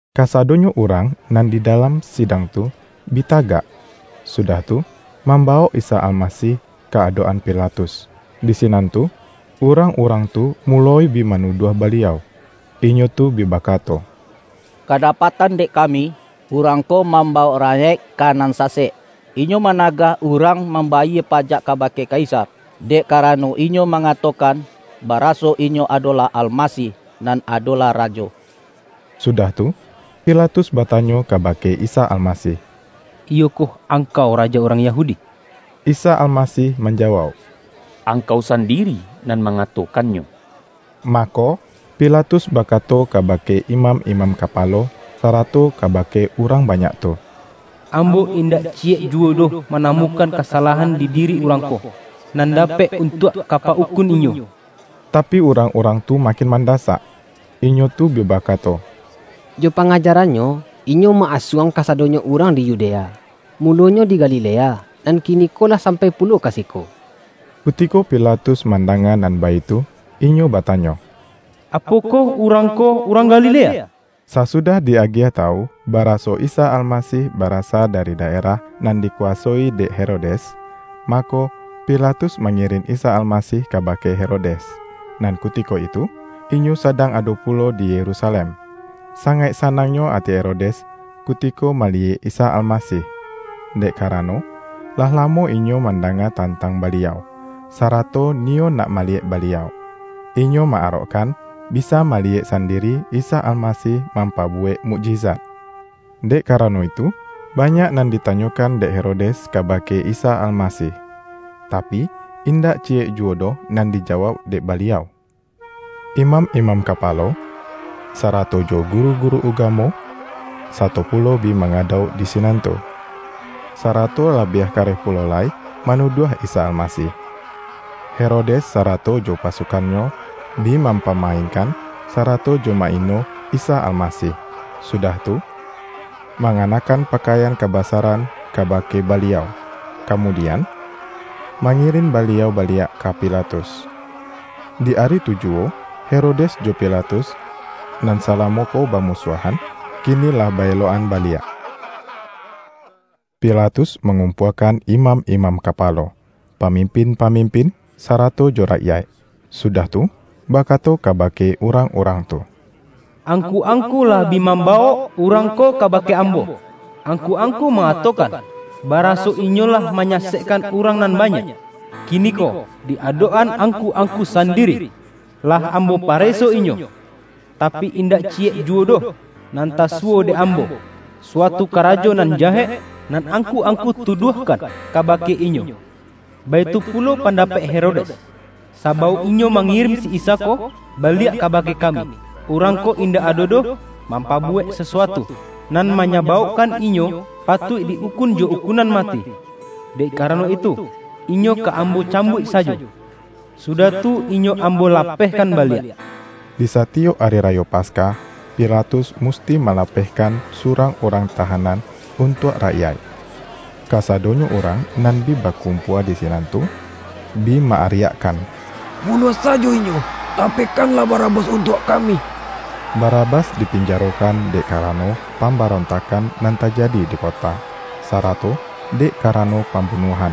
Kasadonyo urang nan di da-lam sidang tu bi tagak, sudah tu, mambawok Isa Almasih ka adok-an Pilatus. Di sinan tu, urang-urang tu muloi bi manuduah Baliau. Inyo tu bi bakato,”Kadapatan dek kami, Urang ko mambawok rakyaik ka nan sasek. Inyo managah urang mambayie pajak kabake Kaisar, dek karano Inyo ma-ngatokan, baraso Inyo adolah Almasih, nan adolah Rajo.” Sudah tu, Pilatus batanyo kaba-ke Isa Almasih,”Iyokoh Angkau Rajo urang Yahudi?” Isa Almasih manjawauk,”Angkau sandiri nan mangatokannyo.” Mako, Pilatus bakato kabake imam-imam kapalo, sarato kabake urang banyak tu,”Ambo indak ciyek juwo doh manamukan kasalahan di diri Urang ko, nan dapek untuak ka pa-ukun Inyo.” Tapi, urang-urang tu makin manda-sak, inyo tu bi bakato,”Jo pangajaran-Nyo, Inyo ma-asuang kasadonyo urang di Yudea; mulonyo di Galilea, nan ki-niko lah sampai pulo ka siko.” Kutiko Pilatus mandanga nan baitu, inyo batanyo,”Apokoh Urang ko, urang Galilea?” Sasudah di-agiah tawu, ba-raso Isa Almasih barasa dari daerah nan dikuwasoi dek Herodes, mako, Pilatus mangirin Isa Almasih kabake Herodes, nan kutiko itu inyo sadang ado pulo di Yerusalem. Sangaik sa-nangnyo ati Herodes, kutiko maliyek Isa Almasih, dek karano, lah lamo inyo mandanga tantang Baliau, sarato ni-yo nak maliyek Baliau. Inyo ma-arok-kan, bisa maliyek sandiri Isa Almasih mampabuwek mukjizat. Dek karano itu, banyak nan ditanyokan dek Hero-des kabake Isa Almasih, tapi, indak ci-yek juwo doh nan dijawauk dek Baliau. Imam-imam kapalo, sarato jo guru-guru ugamo, sato pulo bi mangadauk di sinan tu, sarato labiah kareh pulo lai manuduah Isa Almasih. Herodes sarato jo pasukannyo, bi mampama-inkan, sarato jo ma-ino Isa Almasih, sudah tu, manganakkan pakaian ka-basaran kabake Baliau, kamudian, ma-ngirin Baliau baliak ka Pilatus. Di ari tu juwo, Herodes jo Pilatus, nan salamo ko bamusuahan, kini lah ba-elok-an baliak. Pilatus mangumpuakan imam-imam kapalo, pamimpin-pamimpin, sarato jo rakyaik, sudah tu bakato kabake urang-urang tu,”Angku-ang-ku lah bi mambawok Urang ko kaba-ke ambo, angku-angku mangatokan baraso Inyo lah manyasekkan urang nan banyak. Kiniko, di adok-an ang-ku-angku sandiri, lah ambo pareso Inyo, tapi, indak ciyek juwo doh nan tasuwo dek ambo, suatu karajo nan jahek, nan angku-angku tuduahkan kabake Inyo. Baitu pulo pandapek Herodes, sabauk inyo mangirin si Isa ko baliak kabake kami. Urang ko in-dak ado doh mampabuwek sasuatu, nan manyabaukkan Inyo patuik di-ukun jo ukunan mati. Dek karano itu, Inyo ka ambo cambuik sajo, sudah tu, Inyo ambo lapehkan baliak.” Di satiyok Ari Rayo Paskah, Pila-tus musti malapehkan surang urang tahanan untuak rakyaik. Kasadonyo urang nan bi bakumpua di sinan tu, bi ma-ariakkan,”Bunuah sajo Inyo! Lapehkanlah Barabas untuak kami!” ( Barabas dipinjarokan dek karano pambarontakkan nan tajadi di kota, sarato dek karano pambunuahan.)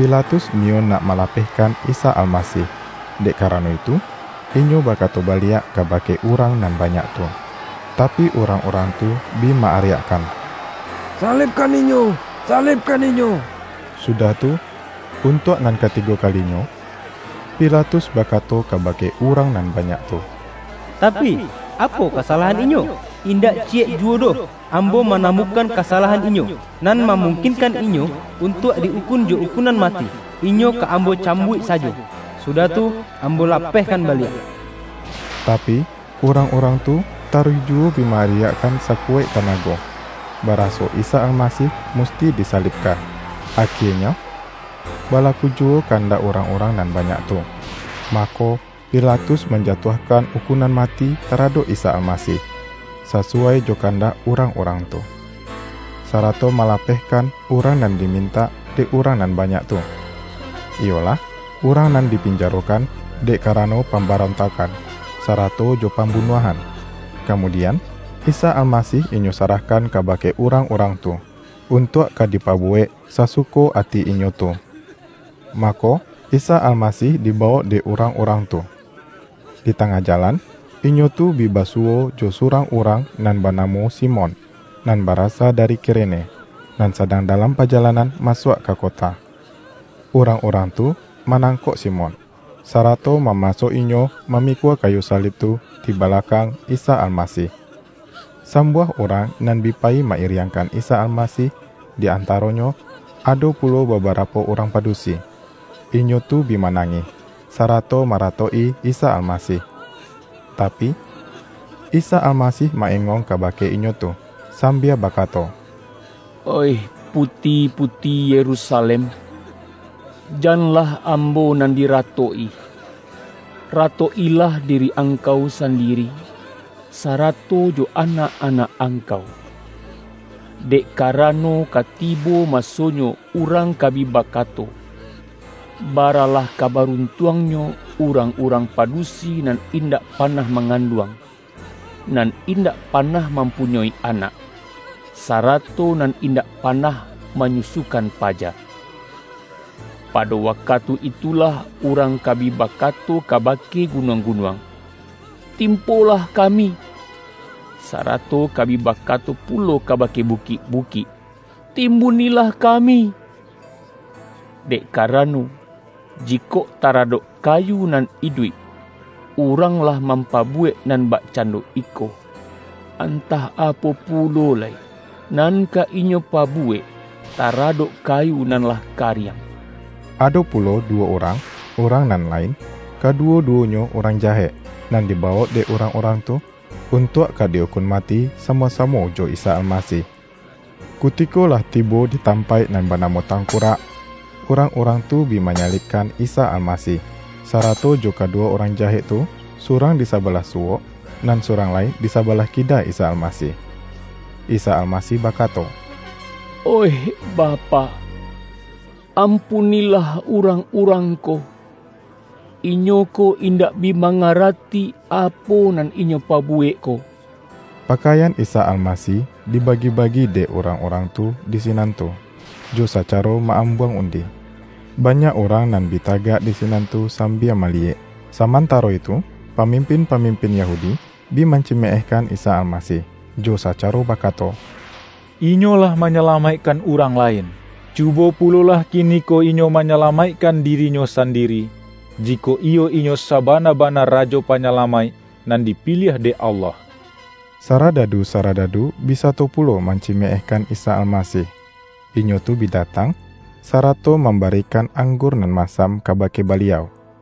Pilatus niyo nak malapehkan Isa Almasih, dek karano itu, inyo bakato baliak kabake urang nan banyak tu. Tapi, urang-urang tu bi ma-ariakkan,”Salibkan Inyo! Salibkan Inyo!” Sudah tu, untuak nan katigo kali-nyo, Pilatus bakato kabake urang nan banyak tu,”Tapi, apo kasalahan Inyo? Indak ciyek juwo doh ambo manamu-kan kasalahan Inyo, nan mamungkin-kan Inyo untuak di-ukun jo ukunan mati! Inyo ka ambo cambuik sajo, su-dah tu ambo lapehkan baliak.” Tapi, urang-urang tu taruih ju-wo bi ma-ariakkan sakuwaik tanago, baraso Isa Almasih musti disalibkan. Akienyo, balaku juwo kandak urang-urang nan banyak tu. Mako, Pila-tus manjatuahkan ukunan mati tara-dok Isa Almasih, sasuwai jo kandak urang-urang tu, sarato malapehkan urang nan dimintak dek urang nan ba-nyak tu, iyolah, urang nan dipinjaro-kan dek karano pambarontakkan, sa-rato jo pambunuahan. Kamudian, Isa Almasih inyo sarahkan kabake urang-urang tu, untuak ka dipabuwek sasu-ko ati inyo tu. Mako, Isa Almasih dibawok dek urang-urang tu. Di tangah jalan, inyo tu bi basuwo jo surang urang nan ba-namo Simon, nan barasa dari Kirene, nan sadang dalam pajalanan masuak ka kota. Urang-urang tu manang-kok Simon, sarato mamaso inyo ma-mikua kayu salib tu di balakang Isa Almasih. Sambuah urang nan bi payi ma-iriangkan Isa Almasih di antaronyo ado pulo babarapo urang padusi. Inyo tu bi manangih, sarato maratok-i Isa Almasih. Tapi, Isa Almasih ma-engong kabake inyo tu, sambia baka-to,”Oih, puti-puti Yerusalem! Janlah Ambo nan diratok-i. Ratok-ilah diri angkau sandiri, sarato jo anak-anak angkau. Dek karano, ka tibo maso-nyo urang ka bi bakato, ’Baralah ka baruntuangnyo, urang-urang padusi nan indak panah manganduang, nan indak panah mampunyoi anak, sarato nan indak panah manyusukan paja!' Pado wakatu itulah urang ka bi ba-kato kabake gunuang-gunuang, ’Tim-polah kami!' Sarato ka bi bakato pulo kabake bukik-bukik, ’Timbunilah ka-mi!' Dek karano, jikok taradok ka-yu nan iduik, urang lah mampabuwek nan bakcando iko, antah apo pulo lai, nan ka inyo pabuwek taradok kayu nan lah kariang!” Ado pulo duwo urang, urang nan lain, —kaduwo-duwonyo urang jahek — nan dibawok dek urang-urang tu, un-tuak ka di-ukun mati samo-samo jo Isa Almasih. Kutiko lah tibo di tampaik nan banamo”Tangkurak”, urang-urang tu bi manyalibkan Isa Almasih, sarato jo kaduwo urang jahek tu surang di sabalah suwok, nan surang lai di sa-balah kida Isa Almasih. Isa Almasih bakato,”Oih Bapak, ampunilah urang-urang ko! Inyo ko indak bi mangarati, apo nan inyo pabuwek ko.” Pakaian Isa Almasih dibagi-bagi dek urang-urang tu di sinan tu, jo sacaro ma-ambuang undi. Banyak urang nan bi tagak di sinan tu sambia ma-liyek, samantaro itu pamimpin-pa-mimpin Yahudi bi mancimeehkan Isa Almasih, jo sacaro bakato,”Inyo lah manyalamaikkan urang lain; cubo pu-lolah kiniko Inyo manyalamaikkan di-ri-Nyo sandiri, jikok iyo Inyo sabana-bana Rajo Panyalamaik nan dipiliah dek Allah!” Saradadu-saradadu bi sato pulo mancimeehkan Isa Almasih. Inyo tu bi datang, sarato mambarikan anggur nan masam kabake Baliau,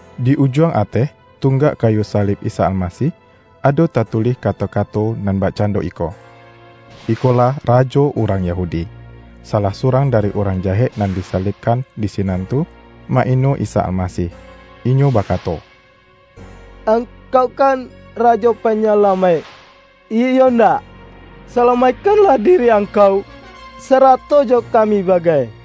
Di ujuang ateh, tunggak kayu sa-lib Isa Almasih, ado tatulih kato-kato nan bakcando iko:”Ikolah Rajo Urang Yahudi.” Salah surang dari urang jahek nan disalibkan di sinan tu, ma-ino Isa Almasih. Inyo bakato,”Angkau kan Rajo Panyalamaik, iyo indak? Sala-maikkanlah diri Angkau, sarato jo ka-mi bagai!”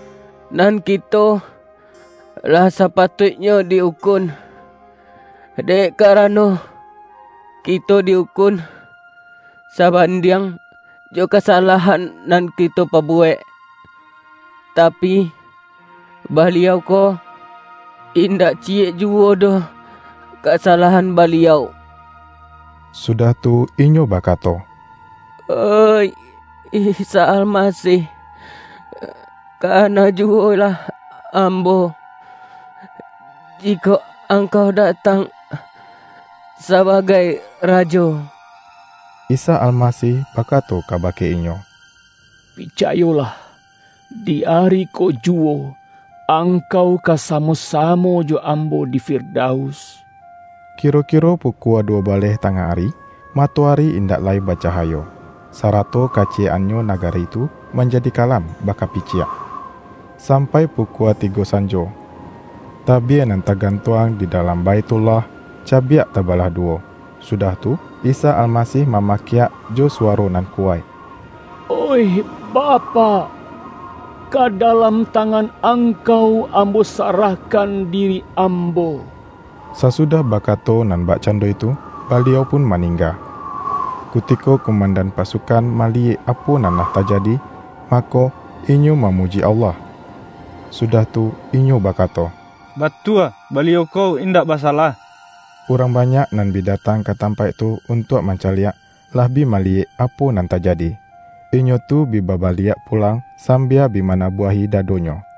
Nan kito lah sapatuiknyo di-ukun, dek karano, ki-to di-ukun sabandiang jo kasalahan nan kito pabuwek. Tapi, Baliau ko, in-dak ciyek juwo doh kasalahan Baliau!” Sudah tu, inyo bakato,”Oih Isa Almasih, kana juwo lah ambo, jikok Angkau datang sabagai Rajo!” Isa Almasih bakato kabake inyo,”Picayolah, di ari ko juwo, angkau ka samo-samo jo Ambo di Firdaus.” Kiro-kiro pukua duwo baleh ta-ngah ari, matoari indak lai bacahayo, sarato kaciyek-annyo nagari tu man-jadi kalam bakapiciak, sampai pukua tigo sanjo. Tabie nan tagantuang di dalam Baithullah, cabiak tabalah duwo. Sudah tu, Isa Almasih ma-makiak jo suwaro nan kuwaik,”Oih Bapak! Ka dalam tangan Angkau Am-bo sarahkan diri Ambo!” Sasudah ba-kato nan bakcando itu, Baliau pun ma-ningga. Kutiko kumandan pasukan ma-liyek apo nan lah tajadi, mako, inyo mamuji Allah. Sudah tu, inyo bakato,”Batua, Baliau ko indak basalah!” Urang banyak nan bi datang ka tampaik tu untuak mancaliak, lah bi maliyek apo nan tajadi. Inyo tu bi ba-baliak pulang, sambia bi manabuahi dadonyo.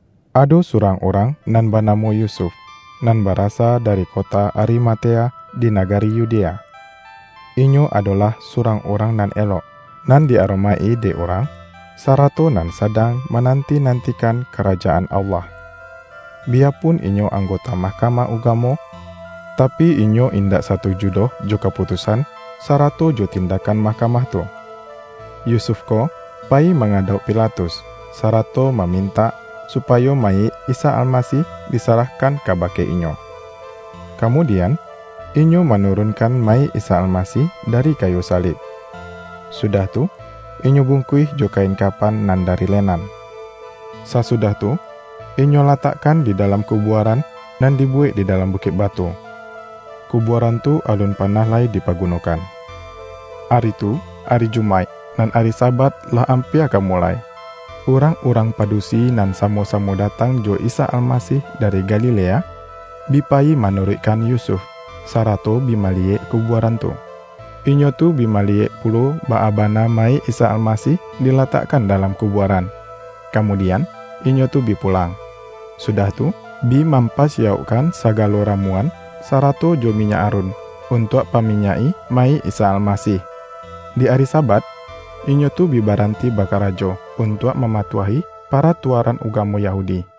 Ado surang urang nan banamo Yusuf, nan barasa dari kota Arimatea di nagari Yudea. Inyo adolah surang urang nan elok, nan di-aromaik-i dek urang, sarato nan sadang mananti-nan-tikan Karajaan Allah. Biyapun inyo anggota Mahkamah Ugamo, tapi, inyo indak satuju doh jo kaputusan, sarato jo tindakkan mahkamah tu. Yusuf ko payi mangadauk Pilatus, sarato ma-mintak supayo mayik Isa Almasih, di-sarahkan kabake inyo. Kamudian, inyo manurunkan mayik Isa Almasih dari kayu salib, sudah tu, inyo bung-kuih jo kain kapan nan dari lenan. Sa-sudah tu inyo latakkan di dalam ku-buaran, nan dibuwek di dalam bukik batu-- kubuaran tu alun panah lai di-pagunokan. Ari tu, ari Jumaik; nan ari Sabat lah ampia ka mulai. Urang-urang padusi nan samo-samo datang jo Isa Almasih dari Ga-lilea, bi payi manuruikkan Yusuf, sa-rato bi maliyek kubuaran tu. Inyo tu bi maliyek pulo baa bana mayik Isa Almasih dilatakkan dalam kubuaran. Kamudian, inyo tu bi pulang, sudah tu, bi mampasiyaukkan sagalo ramu-an, sarato jo minyak arun, untuak pa-minyak-i mayik Isa Almasih. Di ari Sabat, inyo tu bi baranti ba-karajo, untuak mamatuahi paratua-ran ugamo Yahudi.